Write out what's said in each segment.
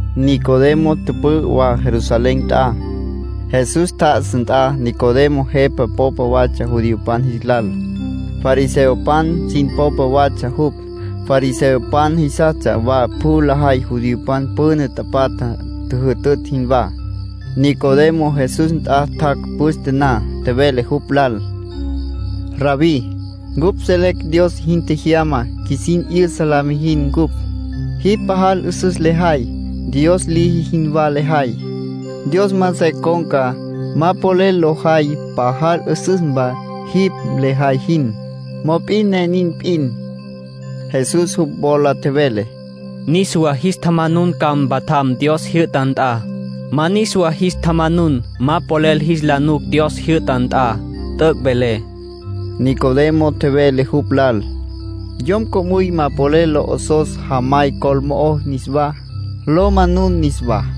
Nicodemo tüpü'ü wa Jerusalén nt'a, Jesús tjá'asa nt'a. Nicodemo jepa popa watsja judiopan jis lal. Fariseopan sin popa watsja jupj. Fariseopan jisastsja wa pjü lajay judiopan püna tapatja tjüjütütj jinwá. Nicodemo Jesús nt'a tjac' püste na. Tjevele jupj lal: —Rabbí, cupj selecj Dios jin tjejyama qjuisin 'yüsa la mijin ncupj. Jipj pajal 'üsüs lejay, Dios liji jinwá lejay. Dios ma se con̈ca, ma polel lo jay pajal 'üsüsmpa jipj lejay jin. Mop'in ne nin p'in. Jesús jupj wola tjevele: —Niswá jis tjamanun ca mpatjam Dios jyü'ta nt'a. Ma niswa jis tjamanun, ma polel jis la nuc Dios jyü'ta nt'a. T'üc' velé. Nicodemo tjevele jupj lal: —Yom co'müy ma polel la 'osos jamay col mo'ó niswá, lo manun niswá.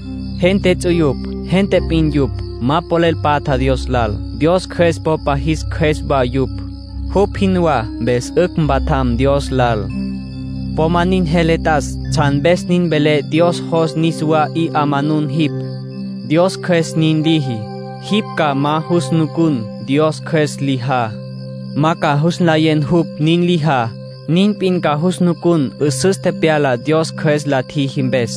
Gente ts'uyupj gente p'in yupj. Ma polel patja Dios lal. Dios Cjües popa jis qjues wa yupj, jupj jinwá, mpes 'ücj mpatjam Dios lal. ”Po ma nin jele t'as tsjan mpes nin velé Dios jos niswa 'i manunu jipj. Dios Cjües nin liji. Jipj ma ca jus nucun Dios Cjües lijá. Ma ca jus nlayen jupj nin lijá. Nin p'in ca jus nucun 'üsüs tepyalá Dios Cjües la tjiji mpes.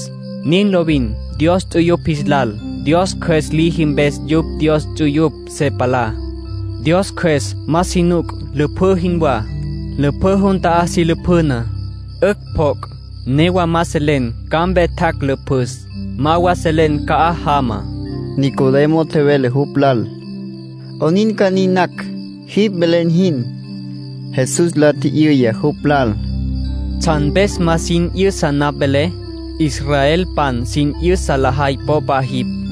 Nin lovin Dios ts'uyupj jis lal. Dios Cjües liji mpes yupj Dios ts'uyupj se palá. Dios Cjües ma si nuc, lüpjǘ jinwá. Lüpjǘ jun ta'á si lapjüna. 'Ücj pjoc', newa ma selen ca'ampe tjac' lüpjüs. Ma wa selen ca'aj jama. Nicodemo tjevele jupj lal: —¿'Onin ca nin nacj, jipj velen jin? Jesús la tji'yüya jupj lal: —¿Tsjan mpes ma jin 'yüsa napj velé? Israelpan sin 'yüsa lajay popa jipj.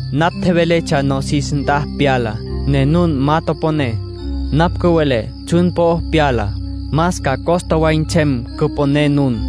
Napj tjeveletsja nosis nt'a pyalá, ne nun ma toponé. Napj cüvelé tsjun po'o pyalá, más ca costa way nsem cüponé nun.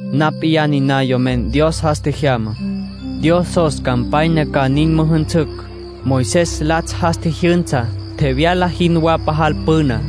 ”Napj p'iyá niná Yomen Dios jas tjejyamá. Dios jos campanya ca nin müjünsücj, Moisés latsj jas tjijyünsa, tjevyala jinwá pajal püna.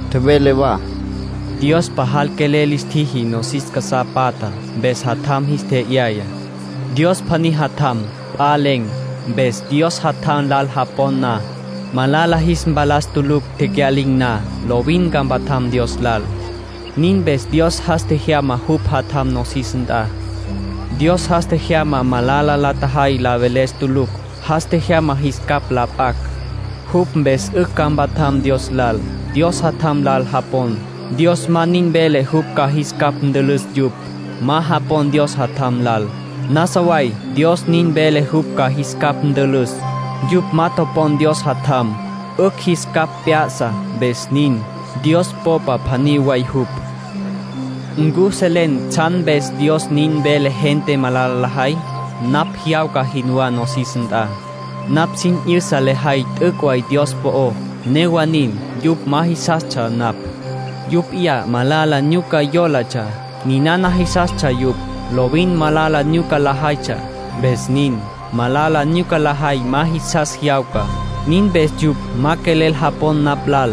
Tjevele wa: —Dios pajal quelel lis tjiji nosis casá patjá, mpes Jatjam jis tje'yaya. Dios pjaní Jatjam. P'a len̈. Mpes Dios Jatjam lal japon na, malala jis mpalas tulucj tecya'lin̈ na. Lovin ca mpatjam Dios lal. Nin mpes Dios jas tjejyama jupj Jatjam nosis nt'a. Dios jas tjejyama malala la tjajay la veles tulucj. Jas tjejyama jis capj la p'acj; jupj mpes 'ücj ca mpatjam Dios lal. ”Dios Jatjam lal japon, Dios ma nin vele jupj ca jis capj ntülüs yupj. Ma japon Dios Jatjam lal, nasa way Dios nin vele jupj ca jis capj ntülüs. Yupj ma topon Dios Jatjam 'ücj jis capj p'ya'sa, mpes nin. Dios Popa pjaní way jupj. ¿Ncu selen tsjan mpes Dios nin vele gente malala lajay? Napj jyawca jinwá nosis nt'a. Napj sin 'yüsa lejay t'üc' way Dios po'ó. Newa nin, yupj ma jisastsja napj. Yupj p'iyá malala nyuca yólatsja, ninana jisastsja yupj. Lovin malala nyuca lajaytsja, mpes nin. Malala nyuca lajay ma jisas jyawca. Nin mpes yupj ma quelel japon napj lal.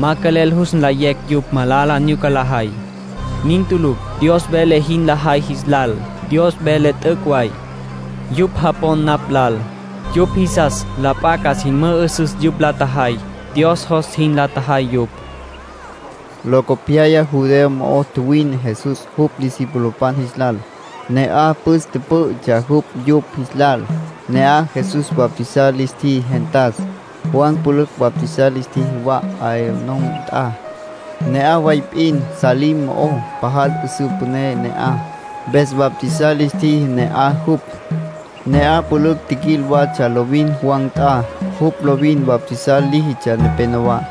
Ma quelel jus nlayecj yupj malala nyuca lajay. Nin tulucj Dios vele jin lajay jis lal. Dios vele t'üc' way. Yupj japon napj lal. Yupj jisas la p'a ca sin mü'üsüs yupj la tjajay, Dios jos jin la tjajay yupj. Locopyaya Judea mo'o tjuwine Jesús jupj discipulopan jis lal. Ne'aj püs pǘ'ütsja jupj yupj jis lal. Ne'aj Jesús bautizar lis tjiji gentas. Juan pülücj bautizar lis tjiji wa Aenón nt'a, ne'aj way p'in Salim mo'ó. Pajal 'üsǘ püné ne'aj, mpes bautizar lis tjiji ne'aj jupj. Ne'aj pülücj tjiquil watsja lovin Juan nt'a. Jupj lovin bautizar líjitsja nepenowá.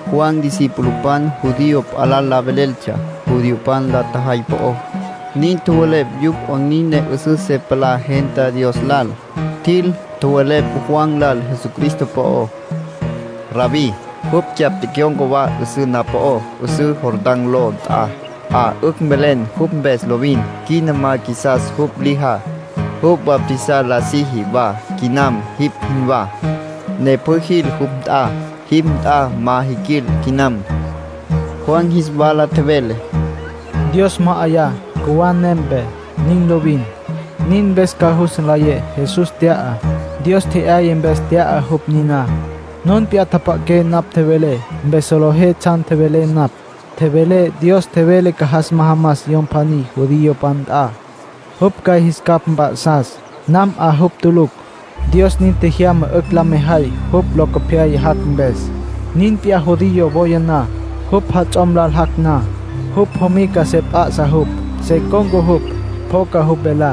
Juan discipulopan judío p'a lal la veleltsja judiopan la tjajay po'ó. Nin tjowelepj yupj 'onin ne 'üsüs se palá gentá Dios lal. Tjil, tjowelepj Juan lal Jesucristo po'ó: —Rabbí, jupj cyapj tecyon̈ca wa 'üsǘ na'aj po'ó, 'üsǘ Jordán ló nt'a. Jipj 'a 'ücj velen jupj mpes lovin. Quina ma qjuisas jupj lijá. Jupj bautizar la siji wa quinam jipj jinwá, ne pjü jil jupj nt'a. Jipj nt'a ma jiquil quinam. Juan jis wala tjevele: —Dios ma 'yaya, cjuwá nempe. Nin lovin. Nin mpes ca jus nlayé Jesús tya'á, Dios tje'yaya mpes tya'a jupj niná. Nun p'iyá tjapja'aqué napj tjevelé, mpes solejé tsjan tjevelé napj. Tjevelé Dios tjevele ca jas majamas Yom pjaní judiopan nt'a. Jupj ca jis capj mp'a'sas. Nam 'a jupj tulucj. Dios nin tjejyama 'ücj la mejay jupj locopyaya jac' mpes. Nin p'iyá judío woya na, jupj jats'om lal jac' na. Jupj jomica se p'a'sa jupj. Se con̈ca jupj, pjoca jupj velá.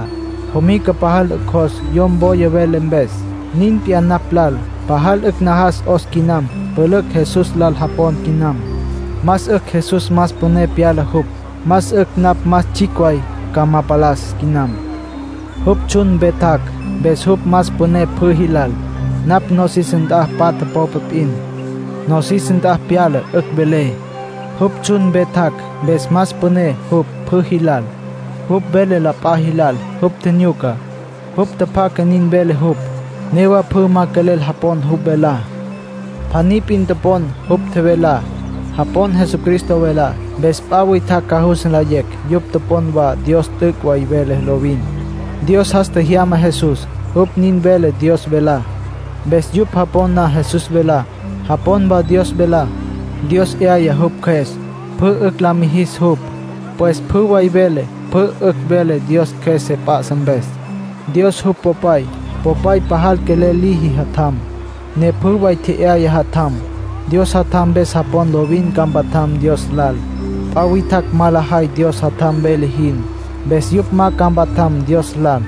Jomica pajal 'ücj jos yom woya vele mpes. Nin p'iyá napj lal. Pajal 'ücj najas 'os quinam pülücj Jesús lal japon quinam. Más 'ücj Jesús más püné pyala jupj. Más 'ücj napj más tsjicj way ca ma palas quinam. ”Jupj tsjun mpe tjac', mpes jupj más püné pjü jilal. Napj nosis nt'a patja popa p'in. Nosis nt'a pyala 'ücj velé. Jupj tsjun mpe tjac', mpes más püné jupj pjü jilal. Jupj vele la p'a jilal jupj tjinyucá, jupj tjapjacá nin vele jupj. Newa pjü ma quelel japon jupj velá. Pjaní p'in topon jupj tjevelá. Japon Jesucristo velá, mpes p'a witjacj ca jus nlayecj yupj japon wa Dios t'üc' way vele lovin. Dios jas tjejyama Jesús. Jupj nin vele Dios velá. Mpes yupj japon na Jesús velá, japon wa Dios velá. Dios 'yaya jupj Cjües, pjü 'ücj la mijis jupj. Pues pjü way vele pjü 'ücj vele Dios Cjües se p'a'sa mpes. ”Dios jupj Popay. Popay pajal quelel liji Jatjam, ne pjü way tje'yaya Jatjam. Dios Jatjam mpes japon, lovin ca mpatjam Dios lal. P'a witjacj ma lajay Dios Jatjam vele jin, mpes yupj ma ca mpatjam Dios lal.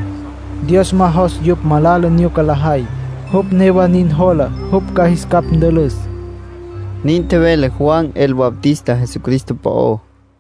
Dios ma jos yupj malala nyuca lajay. Jupj newa nin jola jupj ca jis capj ntülüs —nin tjevele Juan el Bautista Jesucristo po'ó.